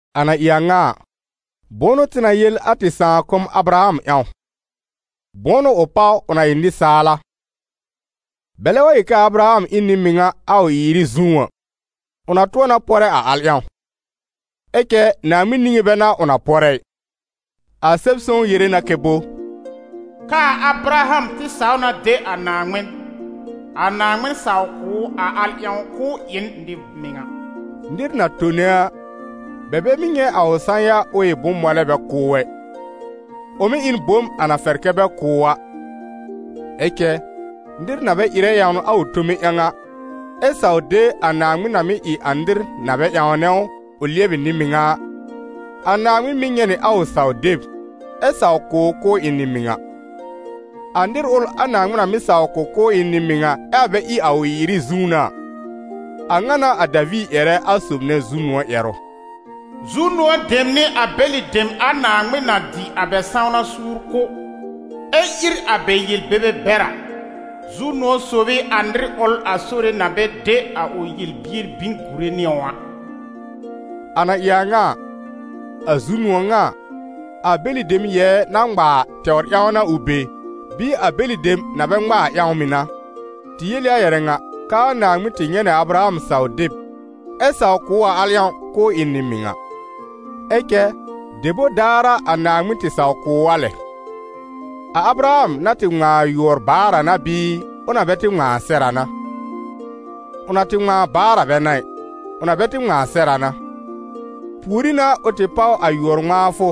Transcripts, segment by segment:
A na ɩ a ŋa a, bʋ̃ʋ n'ʋ tɩ na yel a tɩ sãakʋm Abraham ƴãw? Bʋ̃ʋ n'ʋ ʋ páw, ʋ na ɩ nɩsaal a? Bɛlɛ wa yel k'aa Abraham ɩ n nɩ-mɩŋa a ʋ ɩ-ɩrɩ zũú a, ʋ na tʋ̃ɔ na pɔrɛ a al ƴãw, ɛ cɛ Naaŋmɩn niŋé bɛ n'a ʋ na pɔrɛ ɩ. A Sɛb-sõw yere na kɛ bo? «K'aa Abraham tɩ saw na de a Naaŋmɩn, a Naaŋmɩn saw kʋ̀ ʋ a al ƴãw k'ʋʋ ɩ n nɩ-mɩŋa.» Nɩr na tone a, bɛ bɛ mɩ́ nyɛ̃ a ʋ sã-ya ʋ ɩ bʋ̃-mɔlɛ bɛ kʋ̀ ʋ ɛ, ʋ mɩ́ ɩ n bom a na fɛr kɛ bɛ kʋ̀ ʋ a. Ɛ cɛ, nɩr na bɛ ɩrɛ ƴãwn a ʋ tome ƴãw a, ɛ saw de a Naaŋmɩn na mɩ́ ɩ a nɩr na bɛ ƴãwnɛ ʋ, ʋ lɩɛbɩ nɩ-mɩŋa a, a Naaŋmɩn mɩ́ nyɛ̃ nɩ a ʋ saw-deb, ɛ saw kʋ̀ ʋ k'ʋʋ ɩ n nɩ-mɩŋa. A nɩr ʋl a Naaŋmɩn na mɩ́ saw kʋ̀ k'ʋʋ ɩ n nɩ-mɩŋa, ɛ a bɛ ɩ a ʋ ɩ-ɩrɩ zũú n'a a, a ŋa n'a a Daviir ƴɛrɛ a sob nɛ zu-nʋ̃ɔ̀ ƴɛrʋ: «Zu-nʋ̃ɔ̀ dem ɩ a bɛlɩ dem a Naaŋmɩn na dɩ a bɛ sãwna suur kʋ̀, ɛ ír a bɛ yel-bebe bɛr a. Zu-nʋ̃ɔ̀ sob ɩ a nɩr ʋl a Sore na bɛ de a ʋ yel-bier bin gùre nɩ ʋ a.» A na ɩ a ŋa a, a zu-nʋ̃ɔ̀ ŋa a, a bɛlɩ dem yɛɛ na ŋma a tɛwr ƴãw n'a ʋ be, bɩɩ a bɛlɩ dem na bɛ ŋma a ƴãw mɩ̀ n'a? Tɩ yel ɩ a ƴɛrɛ ŋa k'aa «Naaŋmɩn tɩ nyɛ̃ nɩ a Abraham saw-deb, ɛ saw kʋ̀ ʋ a al ƴãw k'ʋʋ ɩ n nɩ-mɩŋa.» Ɛ cɛ debor daar a Naaŋmɩn tɩ saw kʋ̀ ʋ a lɛ? A Abraham na tɩ ŋmãa a yʋɔr baar a n'a bɩɩ, ʋ na bɛ tɩ ŋmãa sɛr a n'a? Ʋ na tɩ ŋmãa baar a bɛ n'a ɩ, ʋ na bɛ tɩ ŋmãa sɛr a n'a. Pùorí n'a ʋ tɩ páw a yʋɔr-ŋmãafʋ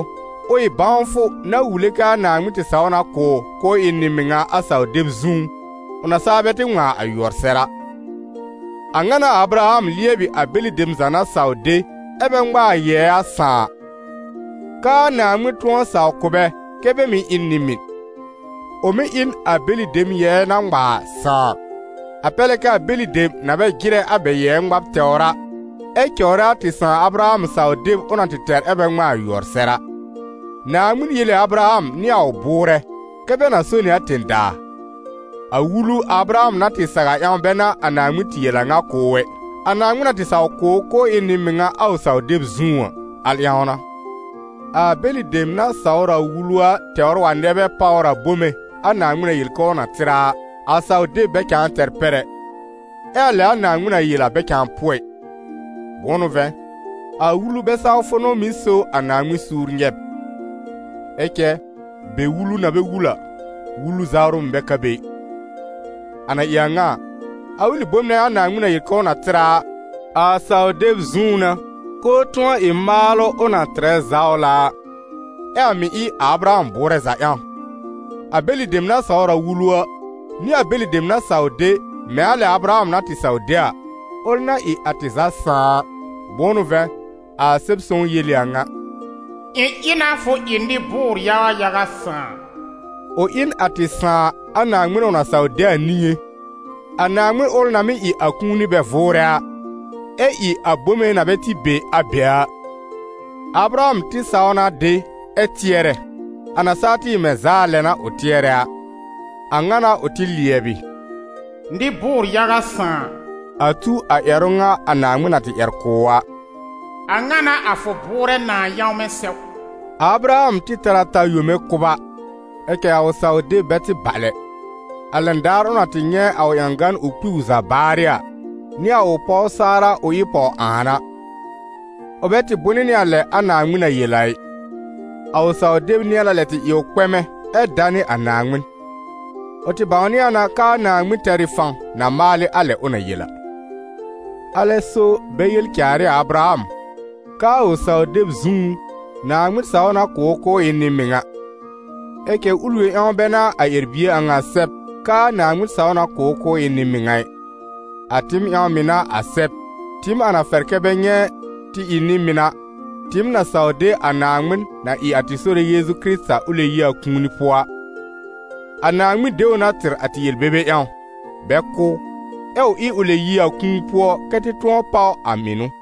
ʋ ɩ bãwfʋ na wule k'aa Naaŋmɩn tɩ saw na kʋ̀ ʋ k'ʋʋ ɩ n nɩ-mɩŋa a saw-deb zũú, ʋ na saa bɛ tɩ ŋmãa a yʋɔr sɛr a. A ŋa n'a a Abraham lɩɛbɩ a bɛlɩ dem za na saw de, ɛ́ bɛ ŋma a yɛɛ a sãà, k'aa Naaŋmɩn tʋ̃ɔ saw kʋ̀ bɛ kɛ́ bɛ mɩ́ ɩ n nɩ-mɩn. Ʋ mɩ̀ ɩ n a bɛlɩ dem yɛɛ na ŋma a sãà, a pɛr lɛ kɛ a bɛlɩ dem na bɛ jɩrɛ a bɛ yɛɛ ŋmab tɛwr a, ɛ cɔwrɛ a tɩ sãà Abraham saw-deb ʋ na tɩ tɛr ɛ́ bɛ ŋmãa a yʋɔr sɛr a. Naaŋmɩn yel ɩ a Abraham nɩ a ʋ bʋʋrɛ kɛ́ bɛ na so nɩ a tẽ-daa. A Wulu a Abraham na tɩ saw a ƴãw bɛ n'a a Naaŋmɩn tɩ yel a a ŋa kʋ̀ ʋ ɛ, a Naaŋmɩn na tɩ saw kʋ̀ ʋ k'ʋʋ ɩ n nɩ-mɩŋa a ʋ saw-deb zũú a, al ƴãw n'a. A bɛlɩ dem na sawr a Wulu a tɛwr wa nɛ bɛ páwr a bome a Naaŋmɩn na yel k'ʋʋ na tɩr a a, a saw-deb bɛ cãa tɛr pɛr ɛ, ɛ a lɛ a Naaŋmɩn na yel a bɛ cãa pʋɔ ɩ. Bʋ̃ʋ n'ʋ vɛ̃, a Wulu-bɛ-sawfʋ n'ʋ mɩ́ so a Naaŋmɩn suur nyɛb; ɛ cɛ be wulu na bɛ wul a, wulu zawrʋ mɩ̀ bɛ ka be ɩ. A na ɩ a ŋa a, a ʋlɩ bom nɛ a Naaŋmɩn na yel k'ʋʋ na tɩr a a, a saw-deb zũú n'a, k'ʋʋ tʋ̃ɔ ɩ maalʋ ʋ na tɩrɛ zawla a, ɛ a mɩ̀ ɩ a Abraham bʋʋrɛ za ƴãw a, a bɛlɩ dem na sawr a Wulu a, nɩ a bɛlɩ dem na saw de, mɛ̃ a lɛ a Abraham na tɩ saw de a, ʋl na ɩ a tɩ za sãà a. Bʋ̃ʋ n'ʋ vɛ̃, a Sɛb-sõw yel ɩ a ŋa: «Ɩ̃ ɩ na fʋ ɩ nɩ-bʋʋr-yaga yaga sãà.» Ʋ ɩ n a tɩ sãà a Naaŋmɩn ʋ na saw de a niŋé, a Naaŋmɩn ʋl na mɩ́ ɩ a kũuni bɛ vʋʋrɛ a, ɛ ɩ a bome na bɛ tɩ be, a be a. A Abraham tɩ saw na de ɛ tɩɛrɛ, a na saa tɩ ɩ mɛ̃ zaa lɛ n'a ʋ tɩɛrɛ a. A ŋa n'a ʋ tɩ lɩɛbɩ «nɩ-bʋʋr-yaga sãà», a tu a ƴɛrʋ ŋa a Naaŋmɩn na tɩ ƴɛr kʋ̀ ʋ a: «A ŋa n'a a fʋ bʋʋrɛ nãà yãwmɛ sɛw.» A Abraham tɩ tɛr a ta yome kʋba, ɛ cɛ a ʋ saw-deb bɛ tɩ bal ɛ, a lɛn daar ʋ na tɩ nyɛ̃ a ʋ ƴãgan ʋ kpi ʋ za baarɩ a, nɩ a ʋ pɔw Saara ʋ ɩ pɔw-ãan a. Ʋ bɛ tɩ bʋnɩ nɩ a lɛ a Naaŋmɩn na yel a ɩ; a ʋ saw-deb nɩ̃ɛ na lɛ tɩ ɩ ʋ kpɛmɛ ɛ danɩ a Naaŋmɩn. Ʋ tɩ bãwnɩ a na k'aa Naaŋmɩn tɛr ɩ fãw na maalɩ a lɛ ʋ na yel a. A lɛ n'a so bɛ yel caar ɩ a Abraham, k'aa ʋ saw-deb zũú, «Naaŋmɩn saw na kʋ̀ ʋ k'ʋʋ ɩ n nɩ-mɩŋa.» Ɛ cɛ ʋl yõ ƴãw bɛ n'a a ƴɛr-bie a ŋa sɛb k'aa «Naaŋmɩn saw na kʋ̀ ʋ k'ʋʋ ɩ n nɩ-mɩŋa ɩ.» A tɩɩm ƴãw mɩ̀ n'a a sɛb, tɩɩm a na fɛr kɛ́ bɛ nyɛ̃ tɩ ɩ nɩ-mɩn a, tɩɩm na saw de a Naaŋmɩn na ɩ a tɩ Sore Yeezu ʋ lɛb yi a kũuni pʋɔ a. A Naaŋmɩn de ʋ na tɩr a tɩ yel-bebe ƴãw, bɛ kʋ́ ʋ, ɛ ʋ ɩ ʋ lɛb yi a kũu pʋɔ kɛ́ tɩ tʋ̃ɔ páw a mɩnʋ.